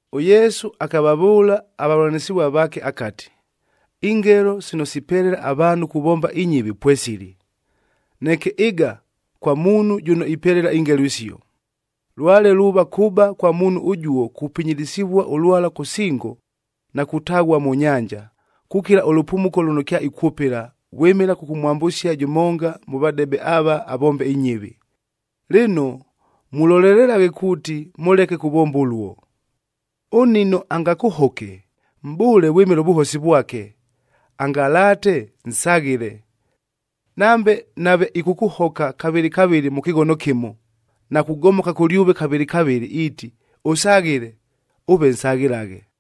ɄYesu akavavʉʉla avavʉlanɨsɨvua vaake akati, “Ingelo sino sipelela avaanhu kuvomba inyɨvi pwesili, neke ɨga kwa muunhu jʉno ipelela ingelo isio! Lwale luuva kʉba kwa muunhu ʉjuo kupinyilisivua ʉlwala kʉ singo na kutaghua mʉ nyanja, kukila ʉlʉpumuko lʉno kyaikwʉpɨla, vwɨmɨla kʉkʉmwambʉsia jʉmonga mʉ vadebe ava avombe inyɨvi! Lɨno, mulolelelaghe kuuti mʉleke kuvomba ʉluo! “Ʉnnino angakʉhoke, mʼbʉʉle vwɨmɨla ʉvʉhosi vwake; angalaate, nsaghɨle. Nambe nave ɨkʉkʉhoka kavɨlɨ kavɨlɨa mʉ kɨghono kɨmo, na kugomoka kʉlyʉve kavɨlɨ kavɨlɨ, iiti, ‘Ʉsaghɨle,’ ʉve nsaghɨlaghe!”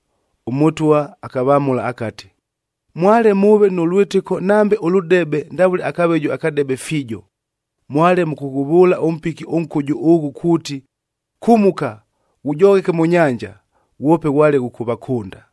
ɄMʉtwa akavamʉla akati, “Mwale mʉʉve nʉ lwɨtɨko nambe ʉlʉdebe ndavʉle akaveju akadebe fiijo, mwale mʉkʉghʉvʉʉla ʉmpiki ʉnkʉjʉ ʉghʉ kuuti, ‘Kumuka, ghujogheke mʉ nyanja!’ Ghwope ghwale ghʉkʉvakʉnda.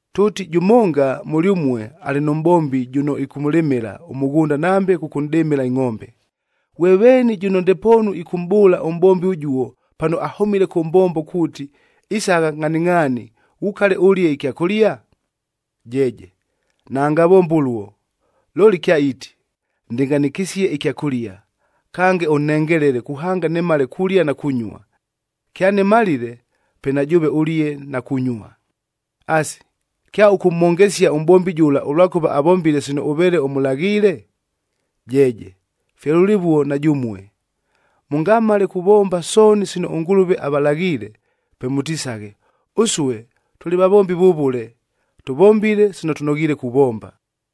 “Tʉʉti jʉmonga mʉlyʉmue alɨ nʉ mʼbombi jʉno ɨkʉkʉlɨmɨla ʉmʉghʉnda nambe ɨkʉkʉdɨmɨla ingʼombe. Ghwe veeni jʉno ndepoonu ɨkʉmʼbʉʉla ʉmʼbombi ʉjuo pano ahʉmile kʉ mbombo kuuti, ‘Isagha ngʼhaningʼhaani ghukale ʉlie ɨkyakʉlia’? Jeeje naangavombe ʉluo. Looli kyaiiti, ‘Ndɨngʼhanɨkɨsie ɨkyakʉlia, kange ʉnhengelele kuhanga nimala kulia na kunyua. Kyanɨmalile, pe na jʉʉve ʉlie na kunyua.’ Asi, kyaʉkʉmhongesia ʉmʼbombi jʉla ʉlwakʉva avombile sino ʉveele ʉmʉlaghiile? Jeeje! Fye lʉlɨvuo na jʉmue, mʉngamale kuvomba sooni sino ʉNgʉlʉve avalaghiile, pe mʉtisaghe, ‘Ʉsue tʉlɨ vavombi vʉvʉle, tʉvombile sino tʉnoghiile kuvomba.’”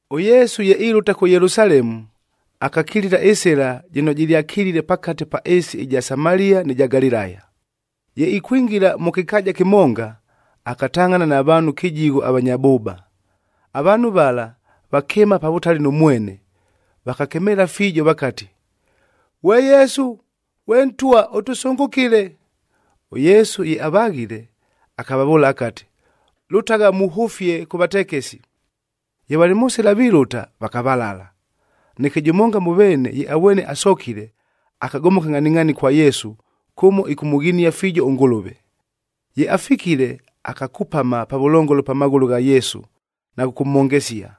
ɄYesu ye ilʉta kʉ Yelusalemu, akakilila ɨsɨla jɨno jɨlyakilile pakate pa ɨɨsi ɨja Samalia nɨ ja Galilaya. Ye ikwingila mʉ kɨkaaja kɨmonga, akatangʼhana na vaanhu kɨjigho avanya bʉʉba. Avaanhu vala, vakɨɨma pa vʉtali nʉ mwene, vakakemeela fiijo vakati, “Ghwe Yesu ghwe Ntwa, ʉtʉsʉngʉkɨle!” ɄYesu ye avaghile, akavavʉʉla akati, “Lʉtagha muhʉfie kʉ vatekesi.” Ye valɨ mʉ sɨla vilʉta, vakavalala. Neke jʉmonga mʉ veene, ye avwene asokile, akagomoka ngʼhaningʼhaani kwa Yesu, kʉmo ɨkʉmʉghinia fiijo ʉNgʉlʉve. Ye afikile, akakupama pavʉlongolo pa maghʉlʉ gha Yesu na kʉkʉmhongesia.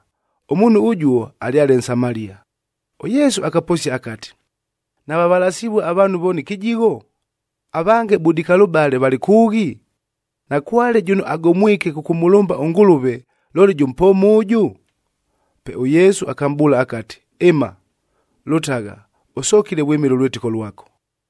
Ʉmuunhu ʉjuo, alyale Nsamalia. ɄYesu akaposia akati, “Navavalasivue avaanhu vooni kɨjigho? Avange budikalʉbale valɨ kʉʉghi? Nakwale jʉno agomwike kʉkʉmʉlʉmba ʉNgʉlʉve, looli jʉ mpooma ʉjʉ?” Pe ʉYesu akamʼbʉʉla akati, “Ɨma, lʉtagha, ʉsokile vwɨmɨla ʉlwɨtɨko lwako!”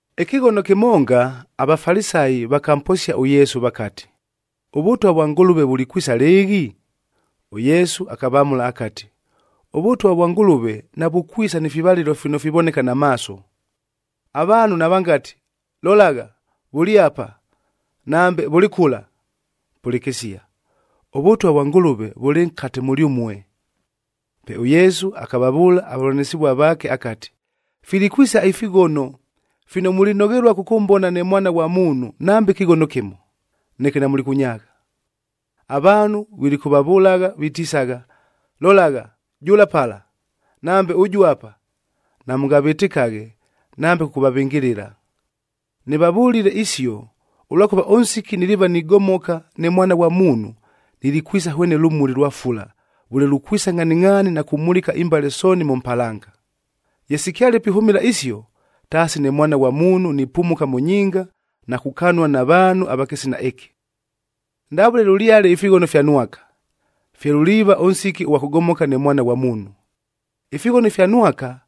Ɨkɨghono kɨmonga, aVafalisayi vakamposia ʉYesu vakati, “ɄVʉtwa vwa Ngʉlʉve vulikwisa lɨɨghi?” ɄYesu akavamʉla akati, “ɄVʉtwa vwa Ngʉlʉve navukwisa ni fivalɨlo fino fivoneka na maaso. Avaanhu navangati, ‘Lolagha! Vʉlɨ apa!’ nambe, ‘Vʉlɨ kʉla!’ Pʉlɨkɨsia, ʉVʉtwa vwa Ngʉlʉve vʉlɨ nkate mʉlyʉmue.” Pe ʉYesu akavavʉʉla avavʉlanɨsɨvua vaake akati, “Filikwisa ifighono, fino mulinoghelua kʉkʉmbona ne Mwana ghwa Muunhu nambe ɨkɨghono kɨmo, neke namulikʉnyaagha. Avaanhu vilikʉvavʉlagha vitisagha, ‘Lolagha! Jʉla pala!’ nambe, ‘Ʉjʉ apa!’ Namʉngavɨtɨkaghe nambe kʉkʉvavɨngɨlɨla. Nɨvavʉlile isio, ʉlwakʉva ʉnsiki niliiva nigomoka ne Mwana ghwa Muunhu, nilikwisa hwene lʉmuli lwa fula vʉle lukwisa ngʼhaningʼhaani na kumulika imbale sooni mʉ mpalanga. Ye sikyale pihʉmɨla isio, taasi ne Mwana ghwa Muunhu nipumuka mʉ nyinga na kukanua na vaanhu ava kɨsina ɨkɨ. “Ndavʉle lʉlyale ifighono ifya Nwaka, fye luliiva ʉnsiki ʉghwa kʉgomoka ne Mwana ghwa Muunhu. Ifighono ifya Nwaka,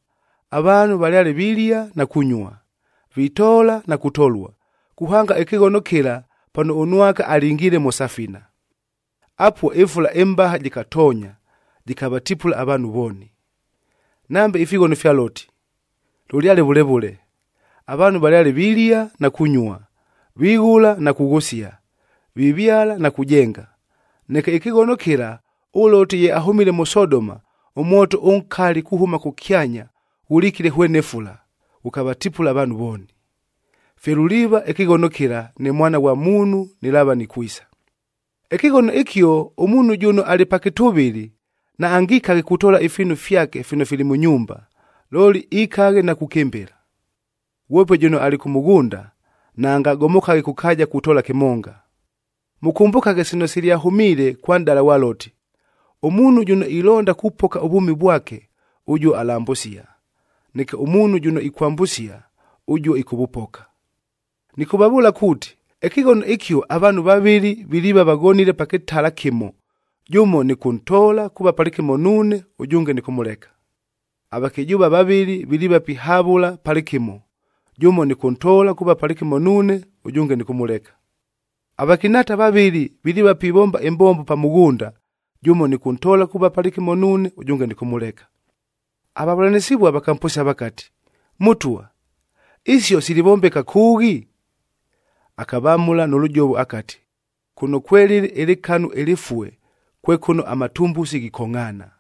avaanhu valyale vilia na kunyua, vitoola na kutolua, kuhanga ɨkɨghono kɨla pano ʉNwaka alingiile mʉ safina. Apuo, ɨfula ɨmbaha jɨkatoonya, jɨkavatipula avaanhu vooni. “Nambe ifighono ifya Loti, lʉlyale vʉle vʉle. Avaanhu valyale vilia na kunyua, vighʉla na kughʉsia, vivyala na kujenga. Neke, ɨkɨghono kɨla ʉLoti ye ahʉmile mʉ Sodoma, ʉmwoto ʉnkali kuhʉma kʉkyanya ghʉlikile hwene fula, ghʉkavatipula avaanhu vooni. Fye luliiva ɨkɨghono kɨla, ne Mwana ghwa Muunhu nɨlaava nikwisa. “Ɨkɨghono ɨkio, ʉmuunhu jʉno alɨ pa kɨtʉvɨlɨ, naangikaghe kutoola ifiinu fyake fino fili mʉ nyumba, looli ikaghe na kukɨmbɨla. Ghwope jʉno alɨ kʉ mʉghʉnda, naangagomokaghe kʉ kaaja kutoola kɨmonga. Mʉkʉmbʉkaghe sino silyahʉmiile kwa nʼdala ghwa Loti.b Ʉmuunhu jʉno ilonda kupoka ʉvwʉmi vwake, ʉjuo alambʉsia; neke ʉmuunhu jʉno ikwambʉsia, ʉjuo ɨkʉvʉpoka. “Nɨkʉvavʉʉla kuuti, ɨkɨghono ɨkio avaanhu vavɨlɨ viliiva vaghonile pa kɨtala kɨmo, jʉmo nɨkʉntoola kuuva palɨkɨmo nuune, ʉjʉnge nɨkʉmʉleka. Avakɨjʉʉva vavɨlɨ viliiva pihavʉla palɨkɨmo, jʉmo nɨkʉntoola kuuva palɨkɨmo nuune, ʉjʉnge nɨkʉmʉleka. Avakɨnhaata vavɨlɨ, viliiva pivomba ɨmbombo pa mʉghʉnda, jʉmo nɨkʉntoola kuuva palɨkɨmo nuune, Avavʉlanɨsɨvua vakamposia vakati, “Mʉtwa, isio silivombeka kʉʉghi?” Akavamʉla nʉ lʉjovo akati, “Kʉno kwelɨlɨ ɨlɨkanu ɨlɨfue kwe kʉno amatumbusi ghikongʼhaana.”